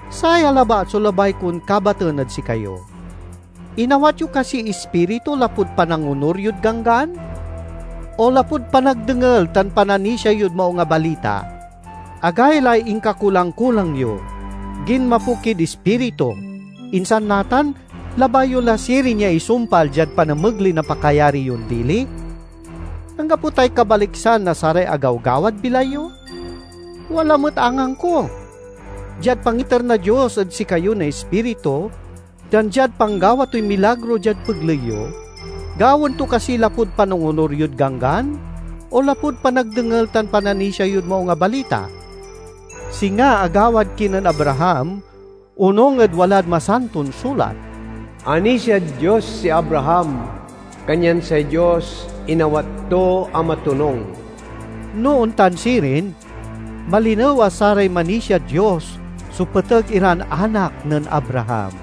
Saya labat so labay kon kabaten ed sikayo: inawat yo kasiy Ispiritu lapud panangonur yod Ganggan, o lapud panagdengel tan pananisia yod Maung a Balita? Agaylay inkakulang-kulang yo! Ginmapo kid Ispiritu; insan natan labay yo la sirin ya isumpal diad panamegley na pakayari yon dili? Anggapo tay kabaliksan na saray agawgawad bilay yo? Wala met angangko! Diad pangiter na Dios ed sikayo na Ispiritu tan diad panggawa toy milagro diad pegley yo, gawaen to kasi lapud panangonur yod Ganggan, o lapud panagdengel tan pananisia yod Maung a Balita? Singa agawad kinen Abraham onung ed walad Masanton Sulat, "Anisiad Dios si Abraham, kanyan say Dios inawat to a matonung." No ontan sirin, malinew a saray manisiad Dios so peteg iran anak nen Abraham.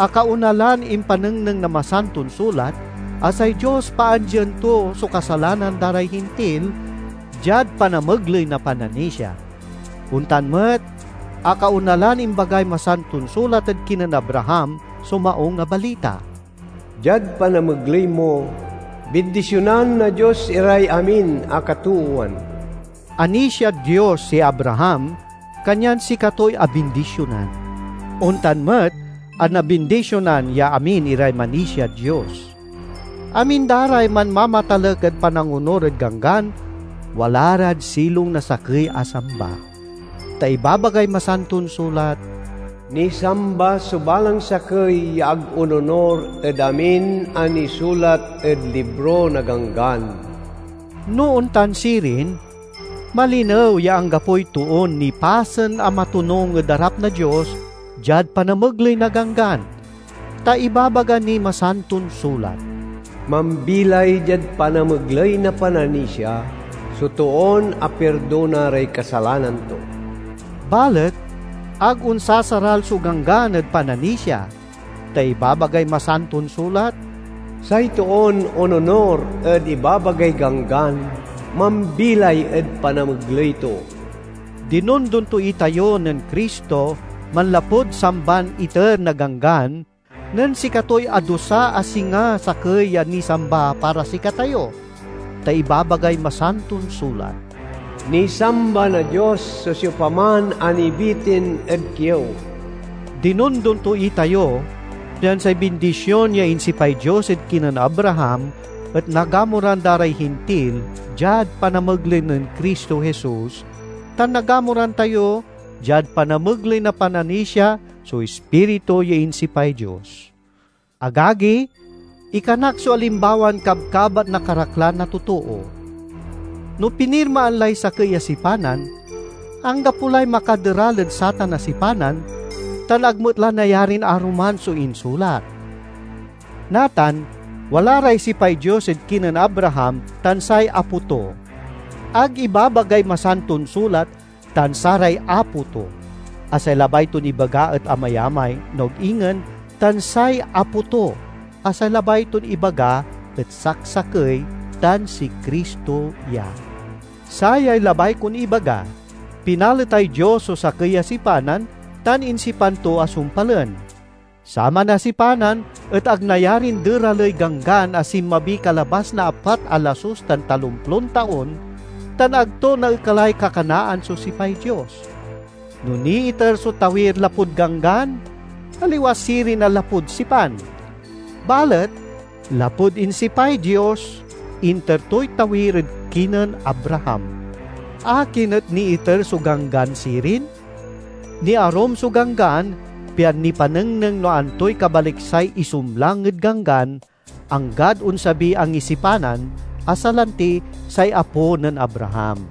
Akaona lan impanengneng na Masanton Sulat a say Dios paandien to so kasalanan da ray Hintil diad panamegley na pananisia. Ontan met, akaona lan imbagay Masanton Sulat ed kinen Abraham so Maung a Balita, "Diad panamegley mo, bindisionan na Dios iray amin a katoowan." Anisiad Dios si Abraham, kanyan sikatoy abindisionan. Ontan met a nabindisionan ya amin iray manisiad Dios. Amin da ray manmamatalek ed panangonur ed Ganggan, wala rad silong na sakey a samba. Ta ibabagay Masanton Sulat, "Nisamba so balang sakey ya ag ononur ed amin a nisulat ed libro na Ganggan!" No ontan sirin, malinew ya anggapoy toon nipasen a matonung ed arap na Dios diad panamegley na Ganggan; ta ibabaga niy Masanton Sulat, "Mambilay diad panamegley na pananisia so toon apirdona ray kasalanan to. " Balet ag onsasaral so Ganggan ed pananisia, ta ibabagay Masanton Sulat, "Say toon ononur ed ibabagay Ganggan mambilay ed panamegley to." Dinondon to itayo nen Cristo manlapud samban iter na Ganggan nen sikatoy adusa a singa sakey ya nisamba para sikatayo; ta ibabagay Masanton Sulat, "Nisamba na Dios so siopaman a nibitin ed kiew." Dinondon to itayo pian say bindision ya insipay Dios ed kinen Abraham et nagamuran da ray Hintil diad panamegley nen Cristo Jesus, tan nagamuran tayo diad panamegley na pananisia so Ispiritu ya insipay Dios. Agagi, ikanak so alimbawan kabkabat na karaklan a totoo. No pinirmaan lay sakey a sipanan, anggapo lay makaderal ed satan a sipanan, tan ag met la nayarin aruman so insulat. Natan, wala ray sipay Dios ed kinen Abraham tan say apo to. Ag ibabagay Masanton Sulat, "tan saray apo to." a say labay ton ibaga et amayamay, no ag ingen "tan say apo to" a say labay ton ibaga et saksakey tan si Cristo ya. Sayay labay kon ibaga: pinaletay Dios so sakey a sipanan tan insipan to a sumpalen. Saman a sipanan et ag nayarin deraley Ganggan a sinmabi kalabas na apat a lasus tan talomplon taon, tan ag to naekalay kakanaan so sipay Dios. No niiter so tawir lapud Ganggan, aliwa sirin a lapud sipan. Balet lapud insipay Dios, inter toy tawir ed kinen Abraham. Akin et niiter so Ganggan sirin? Niarum so Ganggan pian nipanengneng no antoy kabaliksay isumlang ed ganggan, anggad onsabiy angisipanan, a salanti say apo nen Abraham.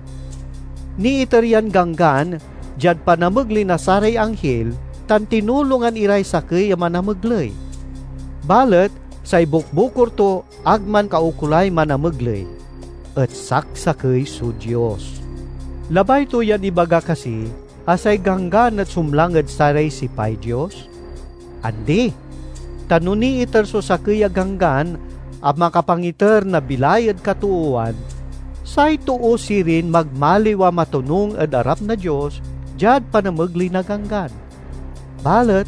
Niiter yan Ganggan diad panamegley na saray anghil, tan tinulongan iray sakey a manamegley. Balet say bukbukor to ag mankaukolay manamegley; et saksakey so Dios. Labay to yan ibaga kasi a say Ganggan et sumlang ed saray sipay Dios? Andi! Ta no niiter so sakey a ganggan a makapangiter na bilay ed katoowan, say too sirin magmaliw a matonung ed arap na Dios diad panamegley na ganggan. Balet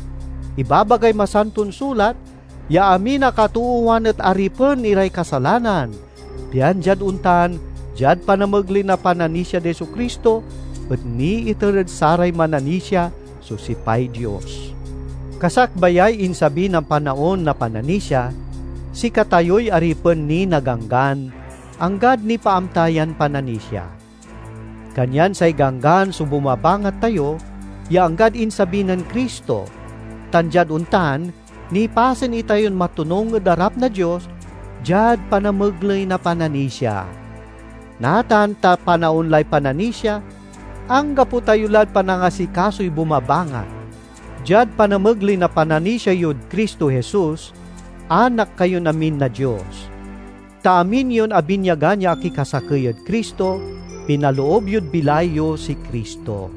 ibabagay Masanton Sulat ya amin a katoowan et aripen iray kasalanan, pian diad ontan diad panamegley na pananisiad Jesu-Cristo et niiter ed saray mananisia so sipay Dios. Kasakbayay insabi na panaon na pananisia, sikatayoy aripen ni na Ganggan, anggad nipaamta yan pananisia. Kanyan say Ganggan so bumabangat tayo ya anggad insabi nen Cristo, tan diad ontan nipasen itayon matonung ed arap na Dios diad panamegley na pananisia. Natan ta panaon lay pananisia, anggapo tayo lad panangasikasoy bumabangat. Diad panamegley na pananisia yod Cristo Jesus, anak kayon amin na Dios. Ta amin yon abinyagan ya akikasakey ed Cristo, pinaloob yod bilay yo si Cristo.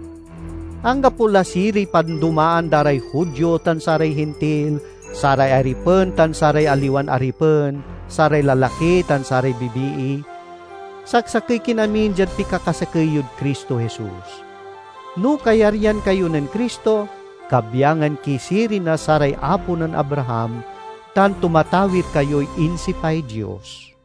Anggapo la siriy pandomaan da ray Judio tan saray Hintil, saray aripen tan saray aliwan aripen, saray lalaki tan saray bibii; saksakey kin amin diad pikakasakey yod Cristo Jesus. No kayaryan kayo nen Cristo, kabyangan ki sirin na saray apo nen Abraham, tan tumatawir kayoy insipay Dios.